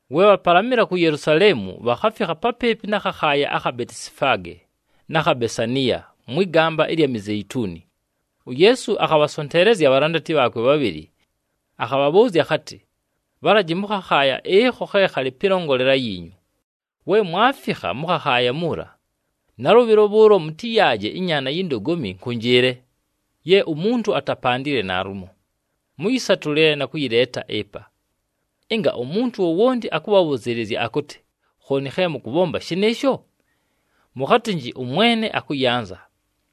We bhapalamɨla ku Yelusaleemu, bhakhafikha papɨɨpɨ na khakhaaya akha Betisifaage na kha Besaniya, mwɨ gamba ɨlya Mizeituni, uYeesu akhabhasonteelezya abhalandati bhaakwe bhabhɨlɨ. Akhabhabhʉʉzya akhatɨ, “Bhalaji mʉ khakhaaya ɨkho khe khalɨ pɨlongolela yiinyu. We mwafikha mʉ khakhaaya muula, nalʉbhɨlo bhʉʉlo mʉtɨyaaje ɨnyaana yi ndogomi nkʉnjɨɨle, ye umuntu atapandile naalumo. Mʉyɨsatʉle na kʉyɨleeta ɨpa. Ɨnga umuntu wowonti akʉbhabhʉzɨɨlɨzya akʉtɨ, ‘Khooni khe mʉkʉbhomba shɨnɨɨsho?’ mʉkhatɨnjɨ, ‘ɄMwene akʉyanza,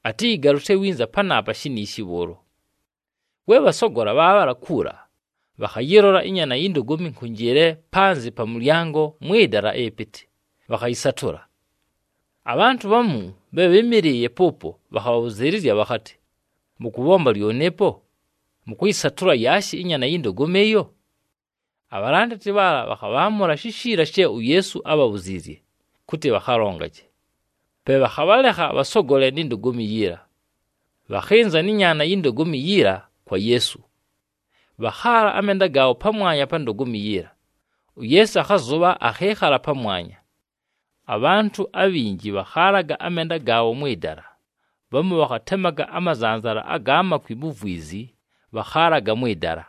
atɨyɨgalʉsye winza panaapa shiniishi bhʉʉlo.’” We bhasogola bhaabhala kuula, bhakhayɨlola ɨnyaana yi ndogomi nkʉnjɨɨle panzɨ pa mʉlyango mwɨ dala ɨpɨtɨ, bhakhayɨsatʉla. Abhantʉ bhamu bhe bhɨ́mɨlɨɨye pʉʉpo bhakhabhabhʉzɨɨlɨzya bhakhatɨ, “Mʉkʉbhomba lyoni ɨpo, mʉkʉyɨsatʉla yaashi ɨnyaana yi ndogomi ɨyo?” Abhalandati bhaala bhakhabhaamʉla shishiila she uYeesu ábhabhuziizye kʉtɨ bhakhalongaje. Pe bhakhabhalekha bhasogole ni ndogomi yiila. Bhakhɨnza nɨ nyaana yi ndogomi yiila kwa Yeesu. Bhakhaala amenda gaabho pamwanya pa ndogomi yiila, uYeesu akhazʉbha, akhɨɨkhala pamwanya. Abhantʉ abhinji bhakhaalaga amenda gaabho mwɨ dala, bhamu bhakhatemaga amazanzala aga makwi mu vwizi, bhakhaalaga mwɨ dala.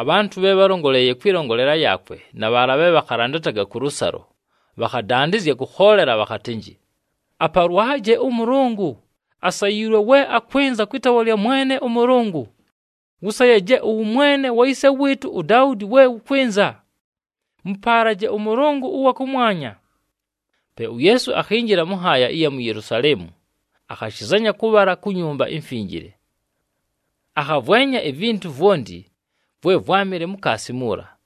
Abhantʉ bhe bhálongoleeye kwɨlongolela yaakwe na bhaala bhe bhakhalandataga kʉlʉsalo bhakhadandɨzya kʉkhoolela bhakhatɨnjɨ, “Apalwaje ʉMʉlʉngʉ! Asayiilwe we akwɨnza kwɨ taawa lya Mwene ʉMʉlʉngʉ! Wʉsayaje ʉwʉmwene wa yise wɨɨtʉ uDaudi we wʉkwɨnza! Mʉpaalaje ʉMʉlʉngʉ ʉwa kʉmwanya.” Pe uYeesu akhinjila mʉ nhaaya ɨya mu Yelusaleemu, akhashɨzanya kʉbhala ku Nyumba iMfinjile. Akhavwenya ivintu vwonti vwe vwámɨle mukaasi muula.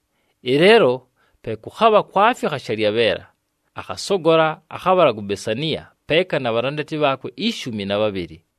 Ɨleelo pe kʉkhabha kwafikha shalyabheela, akhasogola, akhabhala ku Besaniya peeka na bhalandati bhaakwe ishumi na bhabhɨlɨ.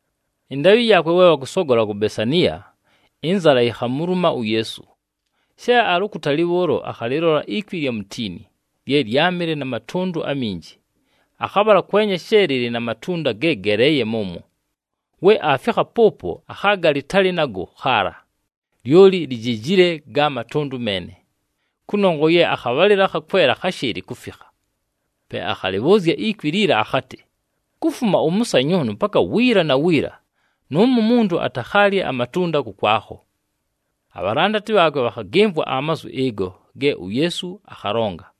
Ɨndaabhɨ yaakwe we bhakʉsogola ku Besaniya, ɨnzala yikhamuluma uYeesu. She alɨ ukutali bhʉʉlo, akhalɨlola ikwi ɨlya mutiini, lye lyámɨle na matʉndʉ aminji. Akhabhala kwenya she lɨlɨ na matunda ge geleeye mʉmwo. We aafikha pʉʉpo, akhaaga lɨtalɨ nago khaala, lyoli lijejile ga matʉndʉ meene, kʉnongwa ye akhabhalɨlo akha kwela kháshɨɨlɨ kufikha. Pe akhalɨbhʉʉzya ikwi liila akhatɨ, “Kufuma ʉmʉsanyʉʉnʉ paka wiila na wiila, nʉʉmo umuntu atakhaalye amatunda kʉkwakho.” Abhalandati bhaakwe bhakhagɨmvwa amazwi ɨgo ge uYeesu akhalonga.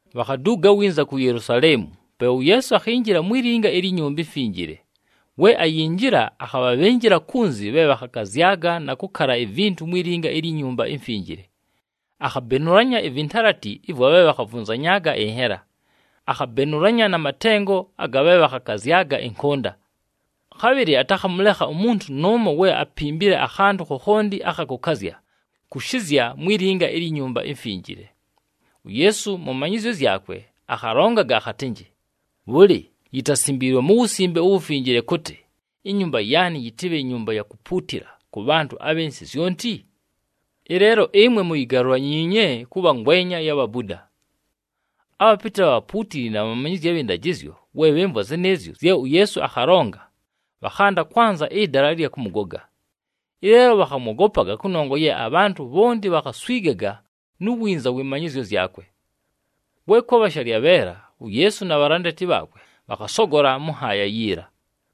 Bhakhaduuga winza ku Yelusaleemu, pe uYeesu akhinjila mwi linga ilyi Nyumba iMfinjile. We ayinjila, akhabhabhɨnjɨla kunzi bhe bhakhakazyaga na kʉkala ivintu mwi linga ilyi Nyumba iMfinjile. Akhabenulanya ivintalati ɨvwa bhe bhakhavunzanyaaga ɨnhela, akhabenulanya na matengo aga bhe bhakhakazyaga ɨnkʉnda. Khabhɨlɨ atakhamʉlekha umuntu nʉʉmo we apimbile akhantʉ khokhonti akha kʉkazya kʉshɨzya mwi linga ilyi Nyumba iMfinjile. UYeesu mʉ manyɨzyo zyakwe akhalongaga akhatɨnjɨ, “Bhʉlɨ, yitasimbiilwe mu Wusimbe uWufinjile kʉtɨ, ‘Inyumba yaanɨ yɨtɨbhe nyumba ya kupuutila kʉ bhantʉ abhɨ nsɨ zyonti’? Ɨleelo ɨmwe muyigalulanyiinye kʉbha ngwenya ya bhabuda!” Abhapɨtɨ abha bhapuutili na bhamanyizyi abhɨ ndajɨzyo, we bhɨmvwa zɨnɨɨzyo zye uYeesu akhalonga, bhakhanda kwanza ɨdala ɨlya kʉmʉgoga. Ɨleelo bhakhamwogopaga, kʉnongwa ye abhantʉ bhonti bhakhaswigaga nu winza wɨ manyɨzyo zyakwe. We kwabha shalyabheela, uYeesu na bhalandati bhaakwe bhakhasogola mʉ nhaaya yiila.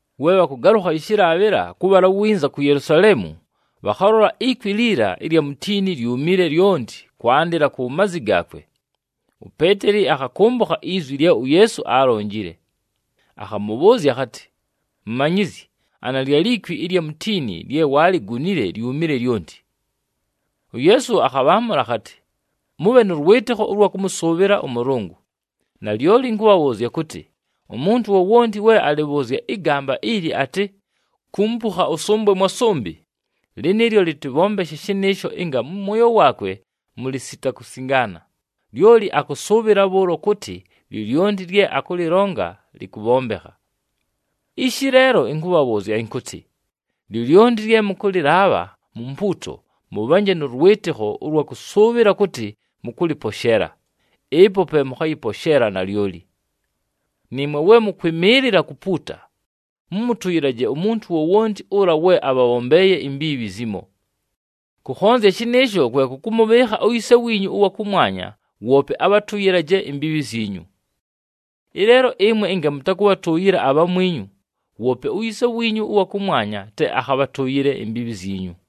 We bhakʉgalʉkha ɨshɨlaabhɨla kʉbhala winza ku Yelusaleemu, bhakhalola ikwi liila ɨlya mutiini lyumile lyonti kwandɨla ku mazi gaakwe. UPeeteli akhakʉmbʉkha izwi lye uYeesu aalonjile, akhamʉbhʉʉzya akhatɨ, “Mumanyizyi, ana lyali kwi ɨlya mutiini lye waaligunile lyumile lyonti!” UYeesu akhabhaamʉla akhatɨ, “Mʉbhe nʉ lwɨtɨkho ʉlwa kʉmʉsʉʉbhɨla ʉMʉlʉngʉ. Nalyoli ɨnkʉbhabhʉʉzya kʉtɨ, umuntu wowonti we alɨbhʉʉzya ɨgamba ili atɨ, ‘Kumpukha ʉsʉmbwe mwa sʉmbɨ,’ lɨnɨɨlyo lɨtɨbhombeshe shɨnɨɨsho ɨnga mʉ mwoyo waakwe mʉlɨ sita kusingaana, lyoli akʉsʉʉbhɨla bhʉʉlo kʉtɨ, lyolyonti lye akʉlɨlonga lɨkʉbhombekha. Ishi leelo ɨnkʉbhabhʉʉzya ɨnkʉtɨ, lyolyonti lye mʉkʉlɨlaabha mu mpuuto, mʉbhanje nʉ lwɨtɨkho ʉlwa kʉsʉʉbhɨla kʉtɨ mʉkʉlɨposheela, ɨpo pe mʉkhayɨposheela nalyoli. Nɨɨmwe we mʉkwɨmɨɨlɨla kupuuta, mʉmʉtʉyɨlaje umuntu wowonti ʉla we abhabhombeeye imbiibhi zimo. Kʉkhonzya shɨnɨɨsho kwe kʉkʉmʉbhɨɨkha uYise wiinyu ʉwa kʉmwanya woope abhatʉyɨlaje imbiibhi zyinyu.” [ Ɨleelo ɨmwe ɨnga mʉtakʉbhatʉʉyɨla abhamwinyu, woope uYise wiinyu ʉwa kʉmwanya te akhabhatʉʉyɨle imbiibhi zyinyu.]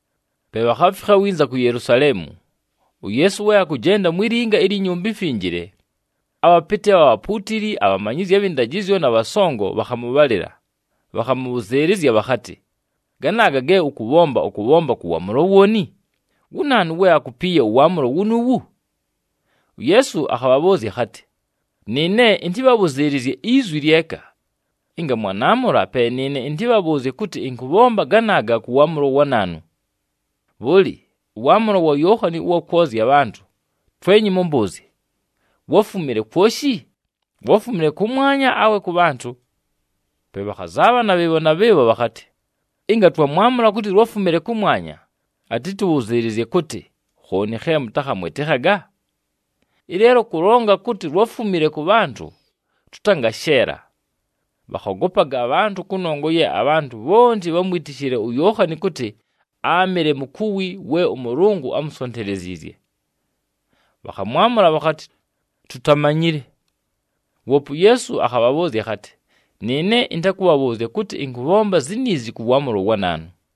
Pe bhakhafikha winza ku Yelusaleemu. UYeesu we akʉjenda mwi linga ilyi Nyumba iMfinjile, abhapɨtɨ abha bhapuutili, abhamanyizyi abhɨ ndajɨzyo na bhasongo bhakhamʉbhalɨla. Bhakhamʉbhʉzɨɨlɨzya bhakhatɨ, “Ganaaga ge ʉkʉbhomba, ʉkʉbhomba kʉ waamʉlo wooni? Wu naanu we akupiiye ʉwaamʉlo wunuuwu?” UYeesu akhabhabhʉʉzya akhatɨ, “Nɨɨne ɨntɨbhabhʉzɨɨlɨzye izwi lyeka. Ɨnga mwanaamʉla, pe nɨɨne ɨntɨbhabhʉʉzye kʉtɨ ɨnkʉbhomba ganaaga kʉ waamʉlo wa naanu. Bhʉlɨ, ʉwaamʉlo wa Yookhani ʉwa kwozya abhantʉ, twenyi mʉmbʉʉzye, wáfumile kwoshi? Wáfumile kʉmwanya awe kʉ bhantʉ?” Pe bhakhazaabhana bhɨɨbho na bhɨɨbho bhakhatɨ, “Ɨnga twamwamʉla kʉtɨ lwáfumile kʉmwanya, atɨtʉbhʉzɨɨlɨzye kʉtɨ, ‘Khooni khe mʉtakhamwɨtɨkhaga?’ Ɨleelo kʉlonga kʉtɨ lwáfumile kʉ bhantʉ, tʉtangasheela.” Bhakhogopaga abhantʉ, kʉnongwa ye abhantʉ bhonti bhámwitishile uYookhani kʉtɨ áamɨle mukuwi we ʉMʉlʉngʉ ámusonteleziizye. Bhakhamwamʉla bhakhatɨ, “Tutamanyile.” Woope uYeesu akhabhabhʉʉzya akhatɨ, “Nɨɨne ɨntakʉbhabhʉʉzya kʉtɨ ɨnkʉbhomba ziniizi kʉ waamʉlo wa naanu.”